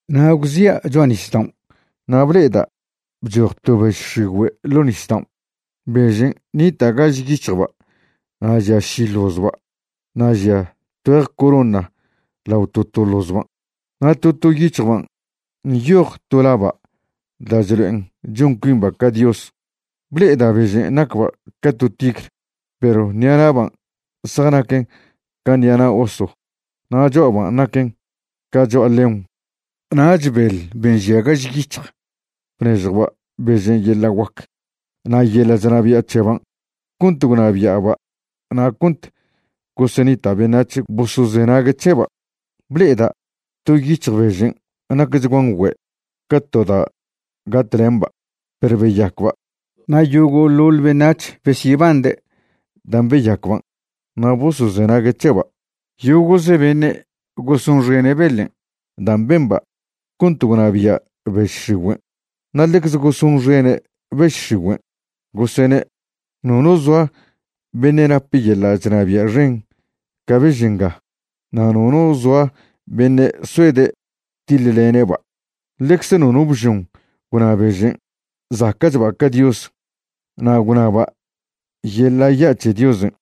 Na' gwzia' cho'a nisdaon' na' ble'eda' bchoj to bež x̱igüe' ḻo' nisdaon'. Bežen' nita' gaž yic̱hjba' na' žia ši ḻozba' na' žia tgüeje corona lao to to ḻozban'. Na' to to yic̱hjban' nyoj to laba' da' chlo'en chon cuimba' ca Dios. Ble'eda' bežen' nacba' ca to tigr, perw ṉi'ana'ban' zjanaquen ca ṉi'a na' oso na' cho'aban' naquen ca cho'a león. Nach beḻ ben' žia gaž yic̱hj bnežjwba' bežen' yeḻa' guac na' yeḻa' chnabia' c̱heban' cont gwnabia'ba' na' cont gosenita' beṉac̱h bosozenague' c̱heba'. Ble'eda' to yic̱hj bežen' nacchguan güe', ca to da' gatlemba', perw beyacba'. Na' yogo'ḻoḻ beṉac̱h besyebande' dan' beyacban' na' bosozenague' c̱heba'. Yogo'ze beṉe' gosonxene' beḻen' dan' bemba' cont gwnabia' bež x̱igüen', na' ḻecze gosonxene' bež x̱igüen', gosene': ―Nono zoa beṉe' nap yeḻa' chnabia' xen ca bež nga, na' nono zoa beṉe' soede' tiḻlene'ba'. Ḻecze nono bžon gwna bežen' zaca'chba' ca Dios, na' gwnaba' yeḻa' ya' c̱he Diosen'.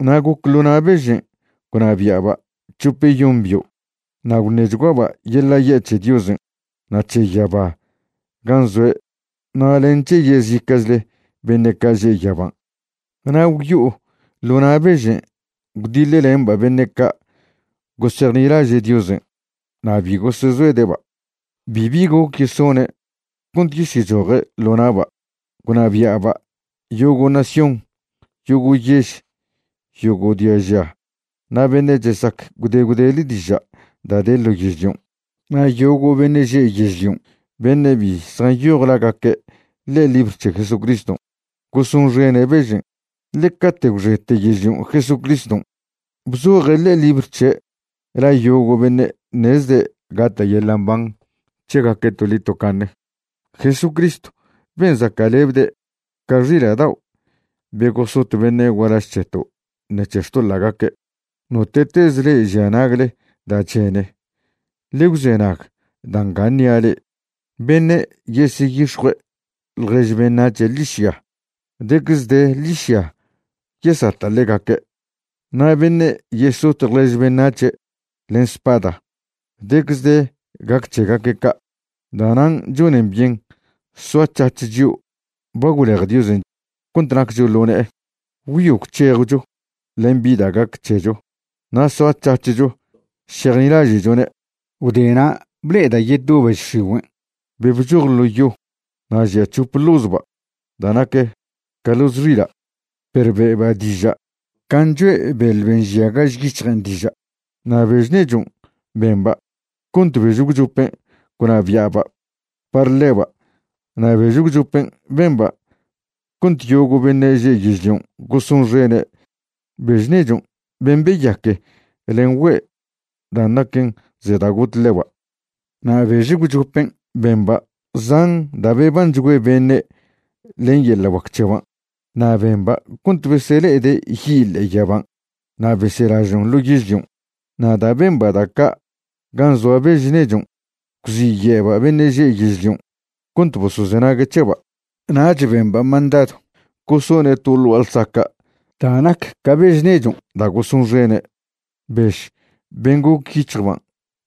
Na' goc ḻo na' bežen' gwnabia'ba' c̱hopeyon bio'. Na' gwṉechguaba' yeḻa' ya' c̱he Diosen' na' c̱he yaba gan' zoe' na' len c̱he yezica'chle beṉe' ca' že' yaban'. Na' gwyo'o ḻo na' bežen' gwdiḻlemba' beṉe' ca' gosejnilaže' Diosen' na' bi gosezoede'ba'. Bibi goc yesone' cont yesyechoje' ḻo na'ba'. Gwnabia'ba' yogo' nación, yogo' yež, yogo' diaža na' beṉe' chesac gwde gwdele diža' da' de ḻo yežlion'. Na' yogo' beṉe' že' yežlion' beṉe' bi zjanyoj lagaque' ḻe'e libr c̱he Jesucriston', gosonxene' bežen'. Ḻe cate' gwxete yežlion' Jesucriston' bzoje' ḻe'e libr c̱he' la yogo' beṉe' ṉezde' gata' yeḻa' mban c̱hegaque' toḻi tocaṉe, Jesucristw ben' zaca'lebde' ca xila' dao' be gosot beṉe' gualaž c̱heto' ṉec̱he xtoḻa'gaque'. Note'tez le'e žia nagle da' chene, ḻe gwzenag da' nga ṉia' le'e. Beṉe' yeseyix̱jue' ḻjež beṉac̱he' ḻižya, decze de ḻižya yesata' ḻegaque'. Na' beṉe' yesot ḻjež beṉac̱he' len spada, decze de gac c̱hegaque' ca'. Da'nan' chonen byen soac̱hac̱h chio' ba gwlej Diosen' cont naccho ḻo ne'e, gwyo gwc̱hejcho len bi da' gac c̱hecho na' soac̱hac̱hcho šejnilaže'chone'. Gwdena' ble'eda' yeto bež x̱igüen' be bchoj ḻo' yo. Na' žia c̱hop ḻozba' da' nac ca ḻoz xila', perw be'ba' diža' can' choe' beḻ ben' žia gaž yic̱hjen' diža'. Na' bež nechon' bemba' cont bež gwchopen' gwnabia'ba' par ḻeba' na' bež gwchopen' bemba' cont yogo' beṉe' že' yežlion' gosonxene' bež nechon' ben' beyaque len güe' dan' naquen ze da' got ḻeba'. Na' bež gwchopen' bemba' zan da' bebanchgüe beṉe' len yeḻa' guac c̱heban', na' bemba' cont besele'ede' yi' ḻe'e yaban' na' beselažon' ḻo yežlion'. Na' da' bemba' da' ca' gan' zoa bež nechon', gwziye'ba' beṉe' že' yežlion' cont bosozenague' c̱heba'. Nach bemba' mandadw gosone' to ḻ gua'a ḻsaca' da' nac ca bež nechon' da' gosonxene', bež ben' goc yic̱hjban'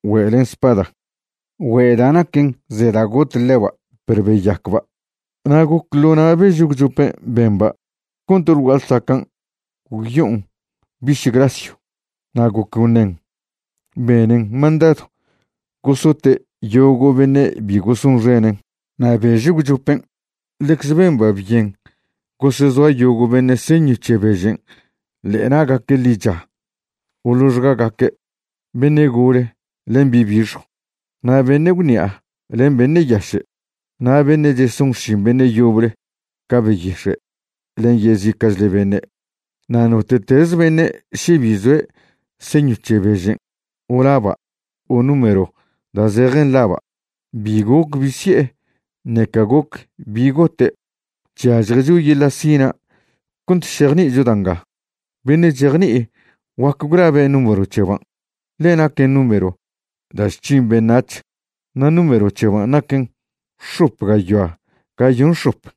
güe' len spada, güe' da' naquen ze da' got ḻeba' perw beyacba'. Na' goc ḻo na' bež gwchopen' bemba' cont ḻ gua'a ḻsacan' gwyo'on biš grasyw. Na' goc gwṉen, benen mandadw gosote' yogo' beṉe' bi gosonxenen'. Na' bež gwchopen' ḻecze bemba' byen gosezoa yogo' beṉe' señw c̱he bežen' ḻe'e na'gaque' ḻicha o ḻoxgagaque', beṉe' gole len bi' bixjw, na' beṉe' gwṉi'a len beṉe' yaše', na' beṉe' cheson xšin beṉe' yoble ca beyix̱e' len yezica'chle beṉe'. Na' note'teze beṉe' še bi zoe' señw c̱he bežen' o laba' o número da' zejen laba', bi goc bi si'e ṉeca goc bi gote'. Chyažjecho yeḻa' sina' cont šejni'icho da' nga. Beṉe' chejni'i guac gwlabe' número c̱heban', ḻe naquen número da' chc̱hin beṉac̱h, na' número c̱heban' naquen x̱op gayoa gayon x̱op.